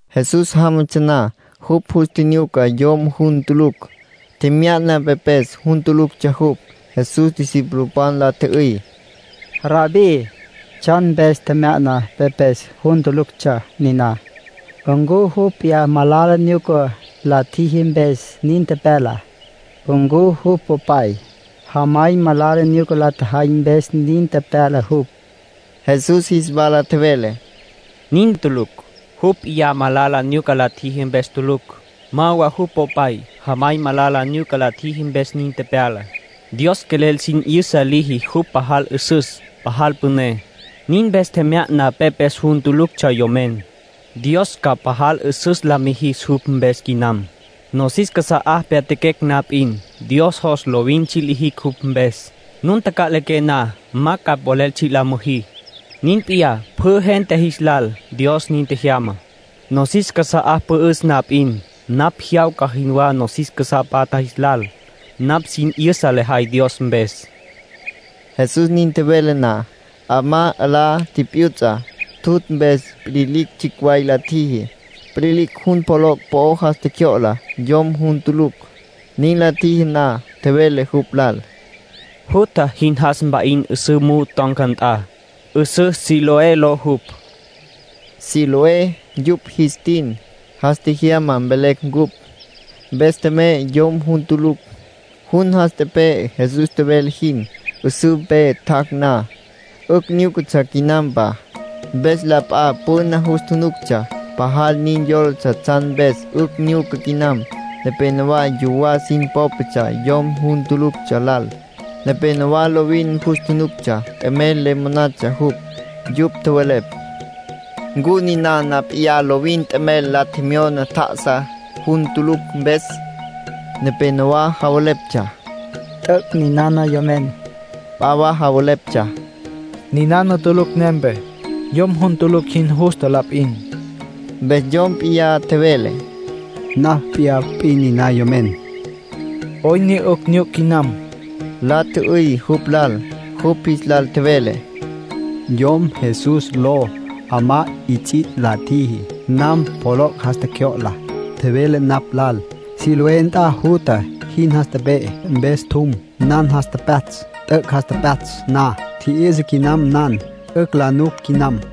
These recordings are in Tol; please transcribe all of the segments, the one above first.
Jesús jámatsja na, jupj jus tjinyuca yom jun tulucj. Tjemya'na pepes jun tuluctsja jupj. Jesús discipulopan la tjü'üy: —Rabbí, ¿tsjan mpes tjemya'na pepes jun tuluctsja niná? ¿Ncu jupj p'iyá malala nyuca la tjiji mpes nin tepyala? ¿Ncu jupj popay, jamay malala nyuca la tjajay mpes nin tepyala jupj? Jesús jis wala tjevele: —Nin tulucj. Jupj p'iyá malala nyuca la tjiji mpes tulucj. Ma wa jupj popay, jamay malala nyuca la tjajay mpes nin tepyala. Dios quelel sin 'yüsa liji jupj pajal 'üsüs, pajal püné. Nin mpes tjemya'na pepes jun tuluctsja yomen. Dios ca pajal 'üsüs la mijis jupj mpes quinam. Nosis casa'á pyatjaquecj na p'in, Dios jos lovin tsji' lijicj jupj mpes. Nun taca'liqué na, ma ca polel tsji' la müjí. Nin p'iyá pjü gente jis lal. Dios nin tjejyama. Nosis casa'a pü'üs na p'in, napj jyawca jinwá nosis casá patja jis lal. Napj sin 'yüsa lejay Dios mpes. Jesús nin tjevele na, 'amá 'alá tipyuts'a. Tjutj mpes pililicj tsjicj way la tjiji. Pililicj jun poloc' po'o jas tjecjyo'la yom jun tulucj. Nin la tjiji na, tjevele jupj lal: —Jutja, jin jas mpa'in 'üsǘ muju ton̈ca nt'a, 'üsǘ Siloé ló jupj. (Siloé yupj jis tin; “Jas Tjejyama” velecj cupj.) Mpes tjemey yom jun tulucj. Jun jas tepe'e Jesús tjevele jin. 'Üsǘ mpe tjac' na, 'ücj nyúcatsja quinampa. Mpes la p'a püna jus tjunuctsja pajal nin yólatsja tsjan mpes 'ücj nyuca quinam. Nepénowa yuwá sin pópatsja yom jun tuluctsja lal, nepénowa lovin jus tjunuctsja t'emel le monatsja jupj. Yupj tjowelepj: “¿Ncu ninana p'iyá lovin t'emel la tjemyona tja'asá, jun tulucj mpes?” Nepénowa javeleptsja: “T'üc'. Ninana yomen.” P'a wa javeleptsja: “Ninana tulucj nempe. Yom jun tulucj jin justa la p'in.” Mpes yom p'iyá tjevele: “Napj mp'iyá p'in niná yomen”. —¿'Oyn ne 'ücj nyuc quinam? —la tjü'üy jupj lal. Jupj jis lal tjevele: —Yom Jesús ló 'amá 'its'its' la tjiji, nan poloc' jas tjecjyo'la. Tjevele napj lal: ‘Siloé nt'a jutja, jin jas tepe'e’. Mpes tjum, nan jas tepyatsj. T'üc' jas tepyatsj na, tji'yü'sa quinam nan. 'Ücj la nuc quinam.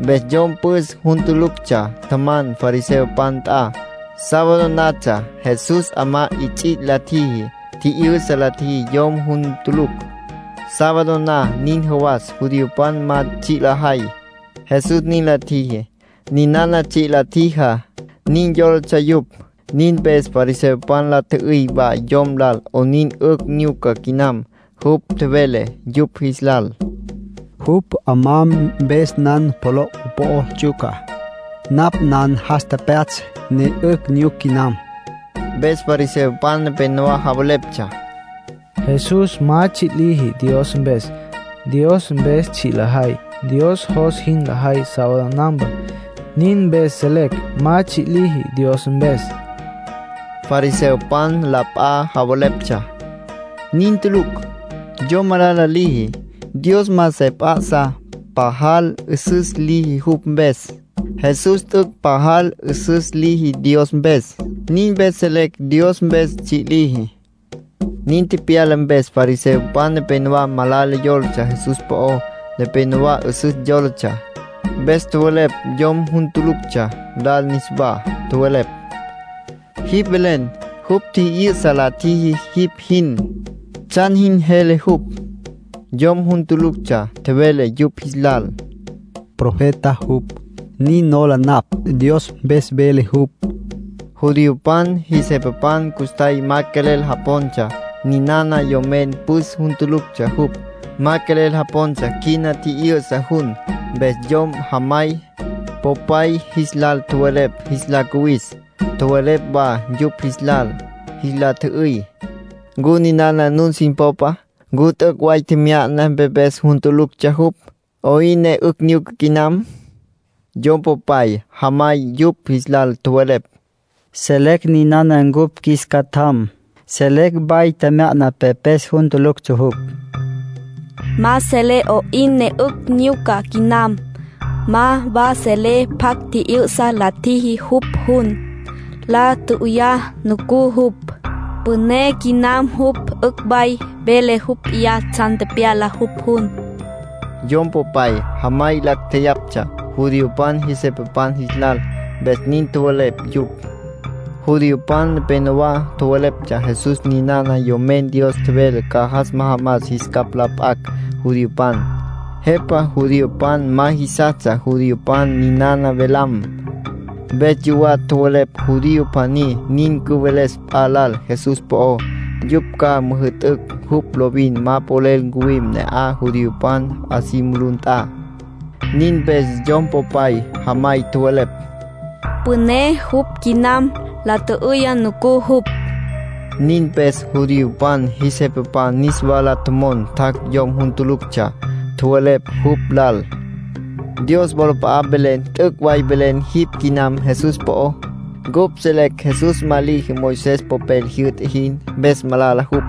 Mpes yom püs jun tuluctsja tjaman fariseopan nt'a. Sábado natsja Jesús 'amá 'its'its' la tjiji, tji'yü'sa la tjiji yom jun tulucj. Sábado na nin jawas judiopan ma tsji' lajay. Jesús nin la tjiji, ninana tsji' la tjijá, nin yólatsja yupj. Nin mpes fariseopan la tjü'üy wa yom lal 'onin 'ücj nyuca quinam. Jupj tjevele yupj jis lal: —Jupj 'amá mpes nan poloc' po'o ts'yuca. Napj nan jas tepyatsj, ne 'ücj nyuc quinam. Mpes fariseopan nepenowá javeleptsja: “Jesús ma tsji' liji Dios mpes. Dios mpes tsji' lajay, Dios jos jin lajay sábado nampa. Nin mpes selecj ma tsji' liji Dios mpes.” Fariseopan la p'a javeleptsja: “Nin tulucj. Yom malala liji, Dios ma se p'a'sa pajal 'üsüs liji jupj mpes. Jesús t'üc' pajal 'üsüs liji Dios mpes. Nin mpes selecj Dios mpes tsji' liji.” Nin tepyala mpes fariseopan nepénowa malala yólatsja Jesús po'ó, nepénowa 'üsüs yólatsja. Mpes tjowelepj yom jun tuluctsja lal niswá. Tjowelepj: —Jipj velen jupj tji'yü'sa la tjiji jipj jin. ¿Tsjan jin jele jupj? Yom jun tuluctsja tjevele yupj jis lal: —Profeta jupj, nin nola napj. Dios mpes vele jupj. Judiopan jis jepapan custjay ma quelel japontsja ninana yomen püs jun tuluctsja jupj. Ma quelel japontsja quina tji'yü'sa jun. Mpes yom jamay, popay jis lal tjowelepj jis la cuwis. Tjowelepj wa yupj jis lal. Jis la tjü'üy: —¿Ncu ninana nun sin popa? ¿Ncu t'üc' way tjemya'na pepes jun tuluctsja jupj? ¿'Oyn ne 'ücj nyuca quinam? Yom popay, jamay yupj jis lal tjowelepj: —Selecj ninana cupj qjuis catjam. Selecj way tjemya'na pepes jun tuluctsja jupj. Ma selecj 'oyn ne 'ücj nyuca quinam. Ma wa selecj pjacj tji'yü'sa la tjiji jupj jun. La tjü'üyá nucú jupj. Püné quinam jupj. 'Ücj way vele jupj p'iyá tsjan tepyala jupj jun. Yom popay, jamay lacj jeyaptsja judiopan jis jepapan jis lal, mpes nin tjowelepj yupj. Judiopan nepénowa tjowelepj Jesús ninana Yomen Dios tjevele ca jas majamas jis capj la p'acj judiopan. Jepa judiopan ma jisastsja judiopan ninana velam. Mpes yuwá tjowelepj judío pjaní nin cüveles p'a lal Jesús po'ó, yupj ca müjü'tücj jupj lovin ma polel ncuwim ne'aj judiopan 'a si mulú nt'a. Nin mpes yom popay, jamay tjowelepj: “Püné jupj quinam. La tjü'üyá nucú jupj.” Nin mpes judiopan jis jepapan niswa la tjomon tjac' yom jun tuluctsja. Tjowelepj jupj lal: —Dios wolap'a'a mvelen t'üc' ca mvelen jipj quinam Jesús po'ó. Cupj selecj Jesús ma liji Moisés popel jyü'ta jin, mpes malala jupj.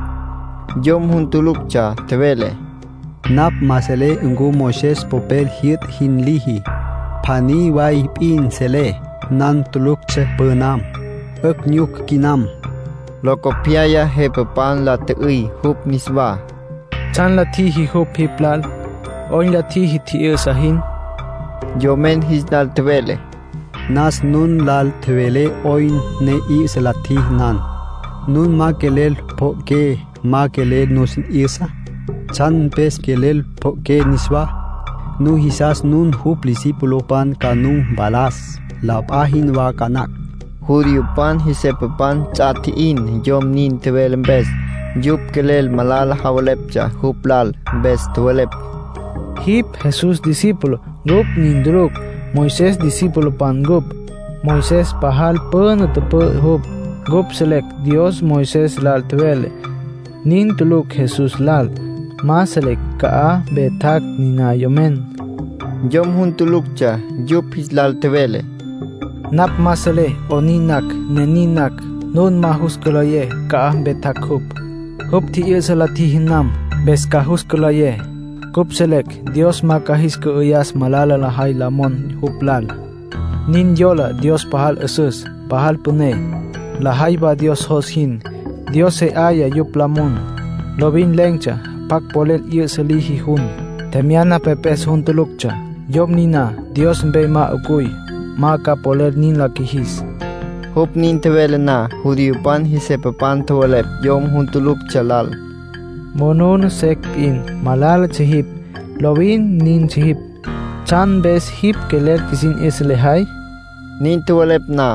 Yom jun tuluctsja tjevele: —Napj ma selé ncu Moisés popel jyü'ta jin liji. Pjaní way p'in selé. Nan tuluctsja pünam; 'ücj nyuc quinam. Locopyaya jepapan la tjü'üy jupj niswá: —¿Tsjan la tjiji jupj jipj lal? ¿'Oyn la tjiji tji'yü'sa jin? Yomen jis lal tjevele: —Nasa nun lal tjevelé 'oyn ne tji'yü'sa la tjiji nan. Nun ma quelel pjo'oqué, ma quelel nusin 'yüsa. ¿Tsjan mpes quelel pjo'oqué niswá? Nujisas nun jupj discipulopan ca nu mpalas, la p'a jinwá ca nacj. Judiopan jis jepapan ts'a tji'in yom nin tjevele mpes. Yupj quelel malala javeleptsja jupj lal, mpes tjowelepj: —Jipj Jesús discípulo; cupj nin tulucj. Moisés discipulopan ncupj, Moisés pajal püna tüpü'ü jupj. Cupj selecj Dios Moisés lal tjevele. Nin tulucj Jesús lal. Ma selecj ca'aj mpe tjac' niná yomen. Yom jun tuluctsja yupj jis lal tjevele: —Napj ma selé 'onin nacj ne nin nacj nun ma jus cülayé ca'aj mpe tjac' jupj. Jupj tji'yü'sa la tjiji nan, mpes ca jus cülayé. Cupj selecj Dios ma ca jis cü'ayas malala lajay la mon jupj lal. Nin yolá Dios pajal 'üsüs, pajal püné, lajay wa Dios jos jin, Dios se 'aya yupj la mon. Lovin len̈tsja pjacj polel 'yü'sa liji jun, tjemya'na pepes jun tuluctsja. Yom niná Dios mpe ma 'ucuy, ma ca polel nin la qjuijis. Jupj nin tjevele na, judiopan jis jepapan tjowelepj yom jun tuluctsja lal: —Monuna secj p'in malálatsja jipj. Lovin nintsja jipj. ¿Tsjan mpes jipj quelel qjuisin 'yüsa lejay? Nin tjowelepj na,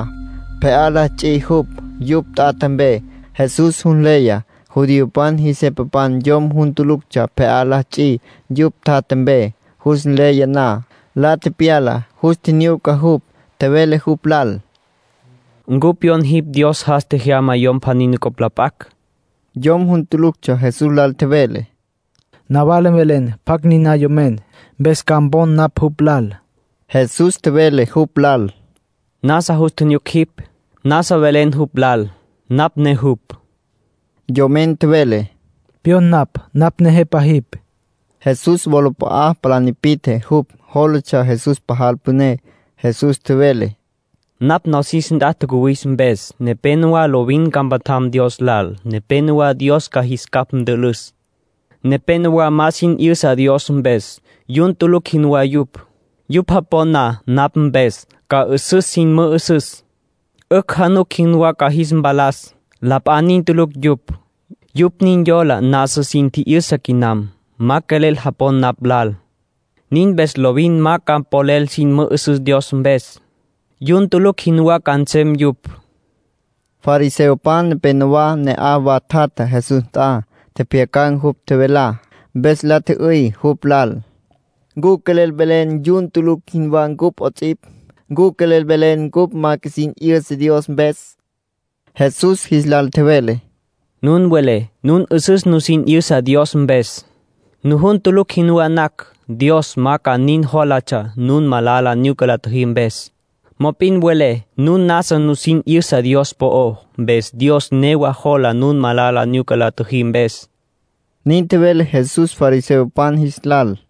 pje'á la ts'i jupj yupj tjatja mpe. Jesús jus nleya judiopan jis jepapan yom jun tuluctsja pje'á la ts'i yupj tjatja mpe. Jus nleya na, la tepyala, jus tjinyuca jupj. Tjevele jupj lal: —¿Ncu pyon jipj Dios jas tjejyama Yom pjaní nucopj la p'acj, jupj tjevele jin? Yom jun tuluctsja Jesús lal tjevele: —Nawala mvelen pjacj niná yomen, mpes ca mpon napj jupj lal. Jesús tjevele jupj lal: —Nasa jus tjinyuc jipj. Nasa velen jupj lal. Napj ne jupj. Yomen tjevele: —Pyon napj. Napj Nejepa jipj. Jesús wolap'a'a palá nipi'tje jupj. Jólatsja Jesús pajal püné. Jesús tjevele: —Napj nosis nt'a tjacuwis mpes, nepénowa lovin ca mpatjam Dios lal. Nepénowa Dios ca jis capj ntülüs. Nepénowa ma sin 'yüsa Dios mpes. Yun tulucj jinwá yupj. Yupj japon na napj mpes, ca 'üsüs sin mü'üsüs. 'Ücj januc jinwá ca jis mpalas. La p'a nin tulucj yupj. Yupj nin yola nasa sin tji'yüsa quinam. Ma quelel japon napj lal. Nin mpes lovin ma ca polel sin mü'üsüs Dios mpes. Yun tulucj jinwá ca nsem yupj —nin tjevele Jesús. Fariseopan nepenowá ne'aj wa tjatja Jesús nt'a. Tjepjyacan̈ jupj tjevelá. Mpes la tjü'üy jupj lal: —¿Ncu quelel velen yun tulucj jinwá cupj 'ots'ipj? ¿Ncu quelel velen cupj ma qjuisin 'yüsa Dios mpes? Jesús jis lal tjevele: —Nun welé nun 'üsüs nusin 'yüsa Dios mpes. Nujun tulucj jinwá nacj, Dios ma ca nin jólatsja nun malala nyuca la tjüjí mpes. Mop'in welé nun nasa nusin 'yüsa Dios po'ó, mpes Dios newa jola nun malala nyuca la tjüjí mpes —nin tjevele Jesús fariseopan jis lal.